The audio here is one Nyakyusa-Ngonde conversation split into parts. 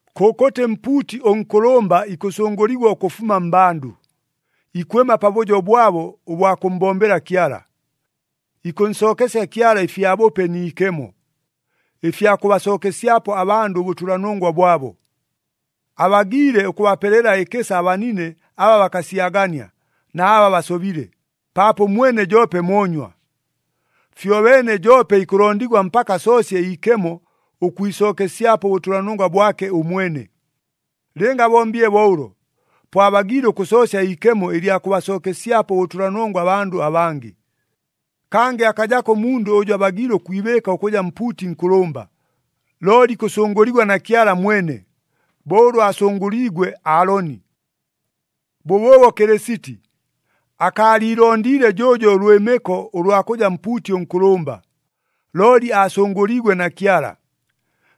Kʉkʉtɨ mpuuti ʉnkʉlʉmba ikʉsʉngʉligwa ʉkʉfuma mmbandʉ, ikwɨma pabʉjo bwabo ʉbwa kʉmmbombela Kyala. Ikʉnsookesya Kyala ɨfyabʉpe ni ikemo, ɨfya kʉbasookesyapo abandʉ ʉbʉtʉlanongwa bwabo. Abagiile ʉkʉbapelela ɨkɨsa abanine aba bakasyagania, na aba basobile, paapo ʉmwene joope moonywa. Fyobeene joope ikʉlondigwa mpaka asoosye iikemo ʉkwisookesyapo ʉbʉtʉlanongwa bwake ʉmwene. Lɨnga abombile bo ʉlo, po abagiile ʉkʉsoosya iikemo ɨlya kʉbasookesyapo ʉbʉtʉlanongwa abandʉ abangɨ. Kangɨ akajako ʉmundʉ ʉjʉ abagiile ʉkwibɨɨka ʉkʉja mpuuti nkʉlʉmba, looli ikʉsʉngʉligwa na Kyala mwene, bo ʉlʉ aasʉngʉliigwe Aaloni. Bʉbʉʉbo Kɨlɨsiti akaaliilondiile jʉʉjo ʉlwɨmɨko ʉlwa kʉja mpuuti ʉnkʉlʉmba, looli aasʉngʉliigwe na Kyala.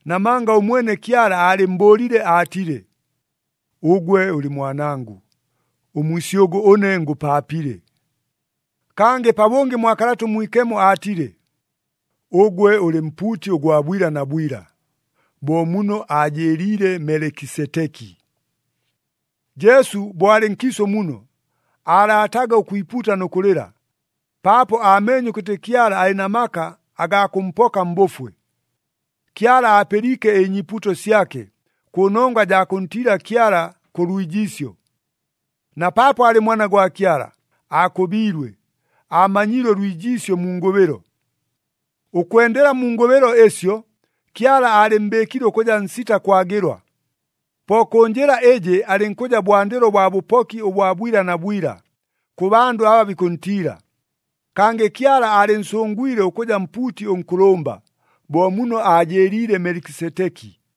Namanga ʉmwene Kyala aalɨmmbʉʉlile aatile, “Ʉgwe ʉlɨ Mwanangʉ, ʉmwisyʉgʉ ʉne ngʉpaapile.” Kangɨ pabʉngɨ mwa Kalata ʉMwikemo aatile, “Ʉgwe ʉlɨ mpuuti ʉgwa bwila na bwila, bo muno aajɨɨliile Melekiseteki.” Jesu bo alɨ nkiisʉ muno, aalaataga ʉkwipuuta nʉ kʉlɨla, paapo aameenye ʉkʉtɨ Kyala alɨ na maka agaa kʉmpoka mbʉfwe. Kyala aapɨliike ɨnyiipuuto syake, kʉnongwa jaa kʉntiila Kyala kʉ lwijiisyo. Na paapo aalɨ Mwana gwa Kyala, aakʉbiilwe, aamanyiile ʉlwijiisyo mu ngʉbɨlo. Ʉkwendela mu ngʉbɨlo ɨsyo, Kyala aalɨmmbɨɨkile ʉkʉja nsita kwagɨlwa. Po kʉ njɨla ɨjɨ alɨnkʉja bwandɨlo bwa bʉpoki ʉbwa bwila na bwila, kʉ bandʉ aba bikʉntiila. Kangɨ Kyala aalɨnsʉngwile ʉkʉja mpuuti ʉnkʉlʉmba, bo muno aajɨɨliile Melekiseteki.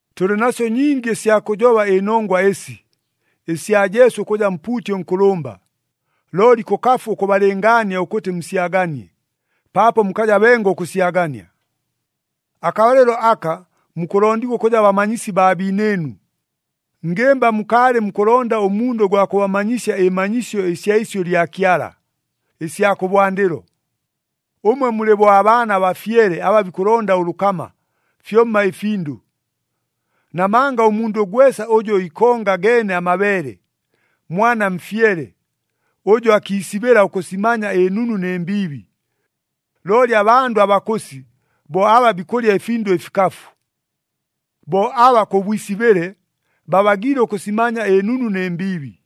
Tʉlɨ nasyo nyingi ɨsya kʉjoba ɨnongwa ɨsi, ɨsya Jesu ʉkʉja mpuuti ʉnkʉlʉmba, looli kʉkafu ʉkʉbalɨngaania ʉkʉtɨ musyaganie, paapo mukaja bengo ʉkʉsyagania. Akabalɨlo aka mukʉlondigwa ʉkʉja bamanyisi baa biinɨɨnu, ngɨmba mukaalɨ mukʉlonda ʉmundʉ ʉgwa kʉbamanyisya ɨmanyisyo ɨsya isyʉ lya Kyala, ɨsya kʉbwandɨlo! Ʉmwe mulɨ bo abaana abafyele aba bikʉlonda ʉlʉkama, fyomma ɨfindʉ. Namanga ʉmundʉ gwesa ʉjʉ ikonga geene amabeele, mwana mfyele ʉjʉ akiisibɨla ʉkʉsimanya ɨnunu nɨ mbiibi. Looli abandʉ abakʉsi bo aba bikʉlya ɨfindʉ ɨfikafu. Bo aba kʉ bwisibɨle, babagiile ʉkʉsimanya ɨnunu nɨ mbiibi.